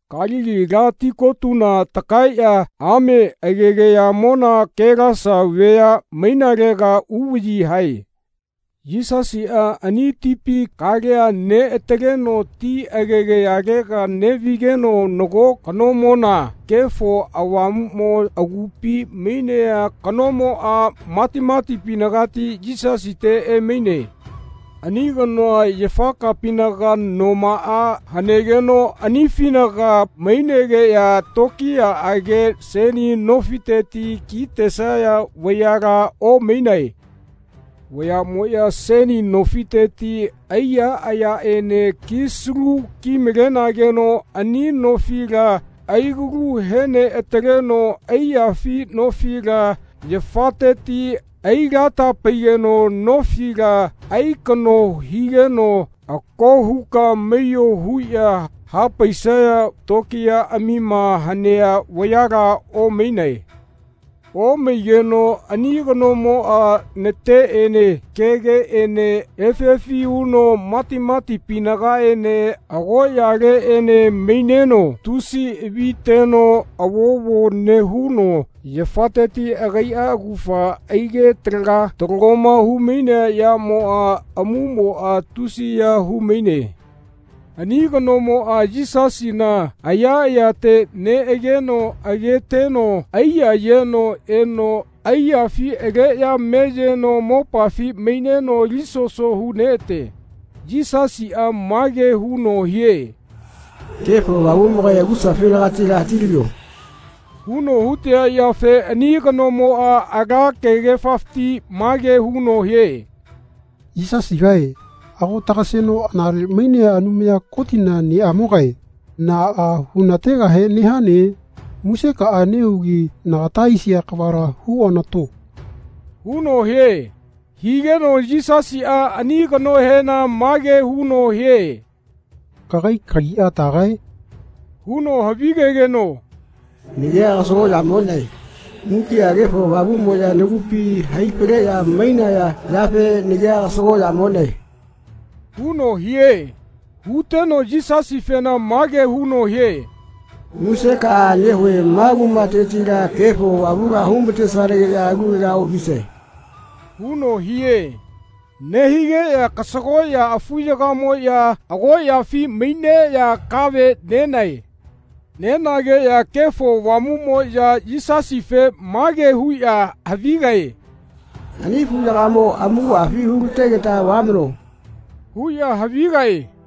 Kalili ala tikotuna takaeꞌya ame agegayamona Kelasa vea mainalega uvaꞌyi hae. Yisasiꞌa ani tipi kalea neꞌataleno ti agegayalega neꞌvigeno nago kanomona Kefo Avamuꞌmo agupi mainea kanomoꞌa matimatipinagati Yisasite emaine. Ani kanoa yafakapinaga nomaꞌa hanegeno anifinaga mainegeꞌya tokiyaꞌage seni nofiteti kitesaya vayala omainae. Vayaꞌmoꞌya seni nofiteti aiya ayaꞌene kisalu kimalenageno ani nofila aigalu heneꞌataleno aiyafi nofila yafateti ailatapegeno nofila aikaꞌno higeno “Ako huka maiyo” huꞌya hapaisaya tokiyaꞌamima hanea vayala omainae. Omaigeno ani kanomoꞌa nateꞌene kegeꞌene efi efi huno matimatipinagaene agoꞌyaleꞌene maineno tusi aviteno avovo nehuno yafateti agaiꞌa augafa aige talaga talagoma humainea yamoꞌa amumoꞌa tusiya humaine. Ani kanomoꞌa Yisasina ayaꞌayate neꞌegeno ageteno aiyayeno eno aiyafi aleꞌya meyeno mopafi maineno alisoso huneꞌate. Yisasiꞌa mage huno hie “Kefo Avamuꞌmogae agusafinagatila hatilavio.” huno hutea yafe ani kanomoꞌa ala kegefafiti mage huno hie “Yisasigae, ago tagaseno anale mainea Anumaya Kotina neꞌamogae, naꞌa hunategahe nehane? Musekaꞌa nehugi nagata aisia kavala huonato.” huno hie. Higeno Yisasiꞌa ani kanohena mage huno hie “Kagai kagia tagae?” huno havigegeno “Nagia Kasagoꞌya-moꞌnae. Mukiꞌa Kefo Avamuꞌmoꞌya nagupi haifaleꞌya mainaya yafe nagia Kasagoꞌyamoꞌnae.” huno hie. Huteno Yisasifena mage huno hie “Musekaꞌa nehue ma kumatetila Kefo Avamula humatesanageꞌya alulega oꞌvisae.” huno hie. Nehigeꞌya kasagoꞌya afuyagamoꞌya agoꞌyafi maineꞌya kave nenae. Nenageꞌya Kefo Avamuꞌmoꞌya Yisasife mage huꞌya havigae “Ani afuyagamo amakuꞌafi hulategeta vamano.” huꞌya havigae.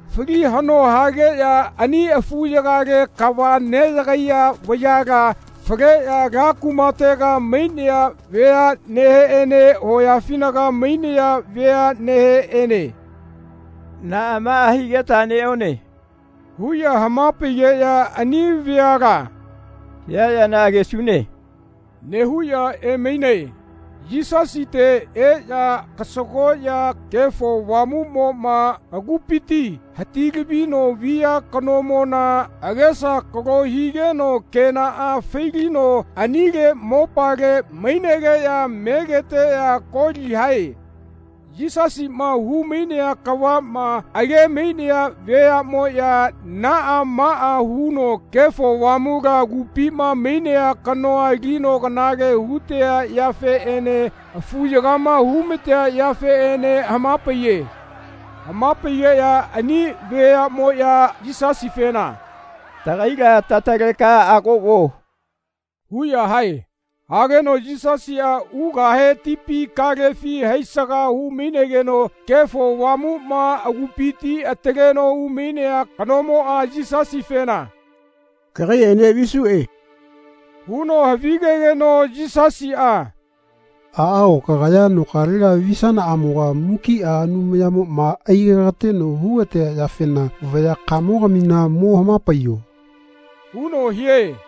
Fali haꞌno hageꞌya ani afuyagale kava neꞌyagaiya vayala faleꞌya ala kumatega mainaya veaꞌneheꞌene hoyafinaga mainaya veaꞌneheꞌene “Naꞌa maꞌa higeta neꞌone.” huꞌya hamapaigeꞌya ani veala “Hia yana agesune.” nehuꞌya emainae. Yisasite eꞌya kasagoꞌya Kefo Avamuꞌmoꞌma agupifiti hatilavino via kanomona agesa akalo higeno kenaꞌa failino anile mopale mainegeꞌya megeteꞌya koli hae. Yisasiꞌma humainea kavaꞌma agemainaya veaꞌmoꞌya naꞌa maꞌa huno Kefo Avamula agupima mainea kanoa alino kanale hutea yafeꞌene afuyagama humatea yafeꞌene hamapaiye. Hamapaigeꞌya ani veaꞌmoꞌya Yisasifena “Tagaila tataleka ago vuo.” huꞌya hae. Hageno Yisasiꞌa ugahe tipi kalefi haisaga hunemaigeno Kefo Avamuꞌma agupiti ataleno umainea kanomoꞌa Yisasifena “Kagaiꞌene visuꞌe.” huno havigegeno Yisasiꞌa “Aꞌao kagaya nokalega visanaꞌamoga mukiꞌa Anumayamoꞌma aigekateno hugatea yafena vayakamogamina mo hamapaiyo.” huno hie.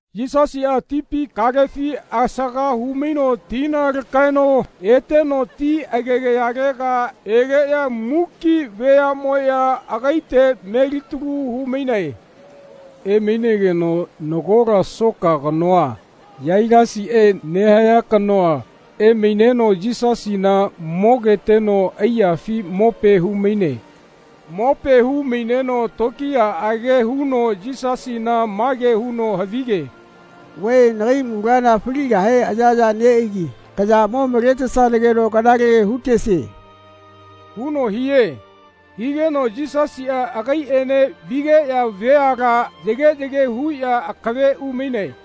Yisasiꞌa tipi kalefi asaga humaino tina lakaeno eteno ti agegayalega egeꞌya muki veaꞌmoꞌya agaite melitalu humainae. Emainageno nagola soka kanoa, Yailasiꞌe nehaya kanoa, emaineno Yisasina mogeteno aiyafi mope humaine. Mope humaineno tokiyaꞌage huno Yisasina mage huno havige “Vae nagai munala faligahe ayaya neꞌaigi kaya mo maletesanageno kanale hutesie.” huno hie. Higeno Yisasiꞌa agaiꞌene vigeꞌya veala yageꞌyage huꞌya akave umainae.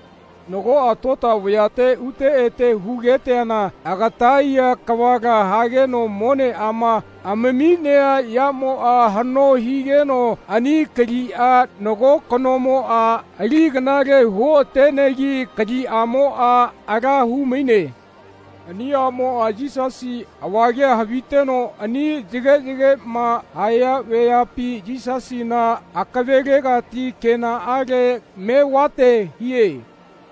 Nagoꞌa tota vayate ute ete hugeteana agataiya kavala hageno moneꞌama amaminea yamoꞌa haꞌno higeno ani kaliꞌa nago kanomoꞌa ali kanale huoꞌatenegi kaliꞌamoꞌa ala humaine. Ani aꞌmoꞌa Yisasi avagea haviteno ani yageꞌyageꞌma haya veapi Yisasina akavelegati kenaꞌale mevate hie.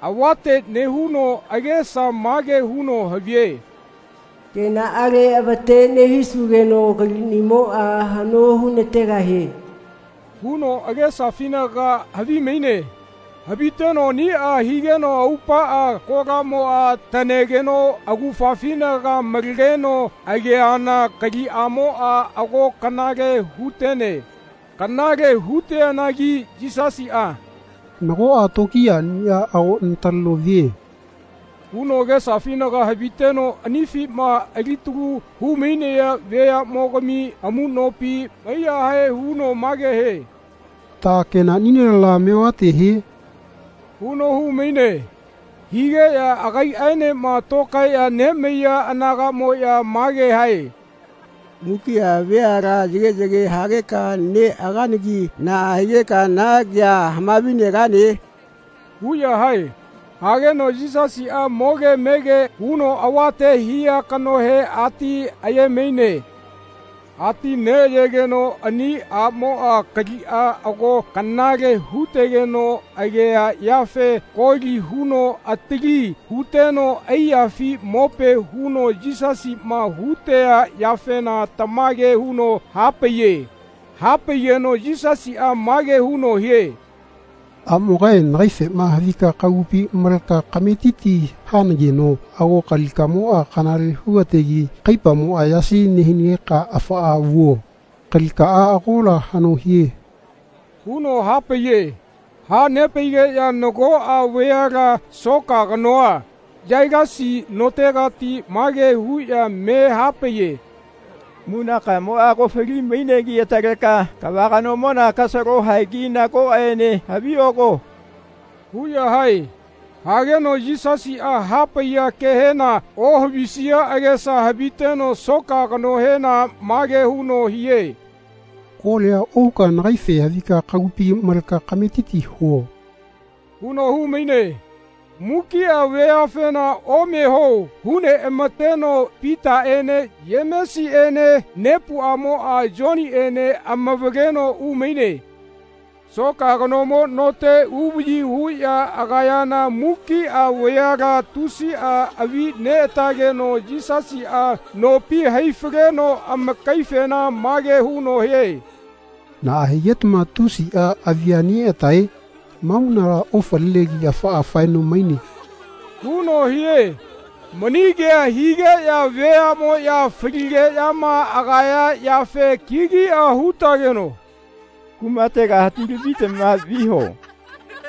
Avate nehuno agesa mage huno havie “Kenaꞌale avate nehisugeno kaliꞌnimoꞌa haꞌno hunategahie.” huno agesafinaga havimaine. Haviteno aniꞌa higeno aupaꞌa kolamoꞌa taꞌnegeno augafafinaga malegeno ageana kaliꞌamoꞌa ago kanale hutene. Kanale huteanagi Yisasiꞌa “Nagoꞌa tokiyaꞌnia ago nataleno vie.” huno agesafinaga haviteno anifima alitalu humainaya veaꞌmogami amuꞌnopi maiyahae huno mage hie “Ta kenaꞌnilela mevate hie?” huno humaine. Higeꞌya agaiꞌaenema tokaeꞌya nemaiya anagaꞌamoꞌya mage hae “Mukiꞌa veala yageꞌyage hageka neꞌaganagi naꞌa higeka na kea hamavinegane?” huꞌya hae. Hageno Yisasiꞌa moge mege huno avate hia kanohe ati ayemaine. Ati neꞌayegeno ani aꞌmoꞌa kaliꞌa ago kanale hutegeno agea yafe koli huno atili huteno aiyafi mope huno Yisasiꞌma hutea yafena tamage huno hapaiye. Hapaigeno Yisasiꞌa mage huno hie “Aꞌmogae nagaifema havika kagupi maleka kametiti hanageno ago kalikaꞌamoꞌa kanale hugategi kaipamoꞌa yasi nehinageka afaꞌa vuo. Kalikaꞌa agola haꞌno hie.” huno hapaiye. Hanepaigeꞌya nagoꞌa vayala soka kanoa, Yailasi notegati mage huꞌya me hapaiye “Munakamoꞌa ago falimainegi ataleka kava kanomona kasalo haegi nagoꞌene havioko.” huꞌya hae. Hageno Yisasiꞌa hapaiya kehena ohavisia agesa haviteno soka kanohena mage huno hie “Kolia ohuka nagaife havika kagupi maleka kametiti huo.” huno humaine. Mukiꞌa veafena omeho huneꞌamateno Pitaꞌene Yemesiꞌene nepuꞌamoꞌa Yoniꞌene amavaleno umainae. Soka kanomo note uvaꞌyi huꞌya agayana mukiꞌa veala tusiꞌa avineꞌatageno Yisasiꞌa nopi haifaleno amakaifena mage huno hie “Naꞌa higetama tusiꞌa avianeꞌatae? Ma munala ofalinegi afaꞌa faeno maine.” huno hie. Mani kea higeꞌya veaꞌmoꞌya faligeꞌyama agaya yafe kigiꞌa hutageno “Kumatega hatilavitama viho.”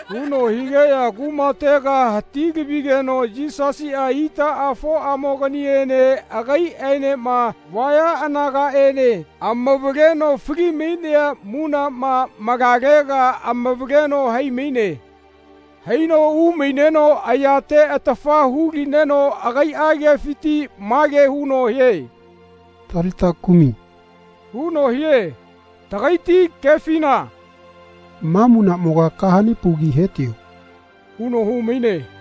huno higeꞌya kumatega hatilavigeno Yisasiꞌa itaꞌafoꞌamoganiene agaiꞌaenema vaya anagaꞌene amavaleno falimainea munaꞌma malalega amavaleno haimaine. Haino umaineno ayate atafa hulineno agaiꞌa kefiti mage huno hie “Talita kumi.” huno hie. Tagaiti kefina “Ma munaꞌmoga kahanepaugi hetio.” huno humaine.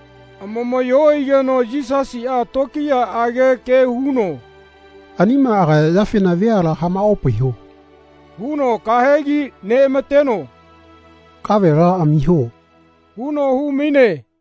Amamaꞌyo aigeno Yisasiꞌa tokiyaꞌage ke huno “Anima agaya yafena veala hamaꞌopaiho” huno kahegi neꞌamateno “Kavela amiho.” huno humaine.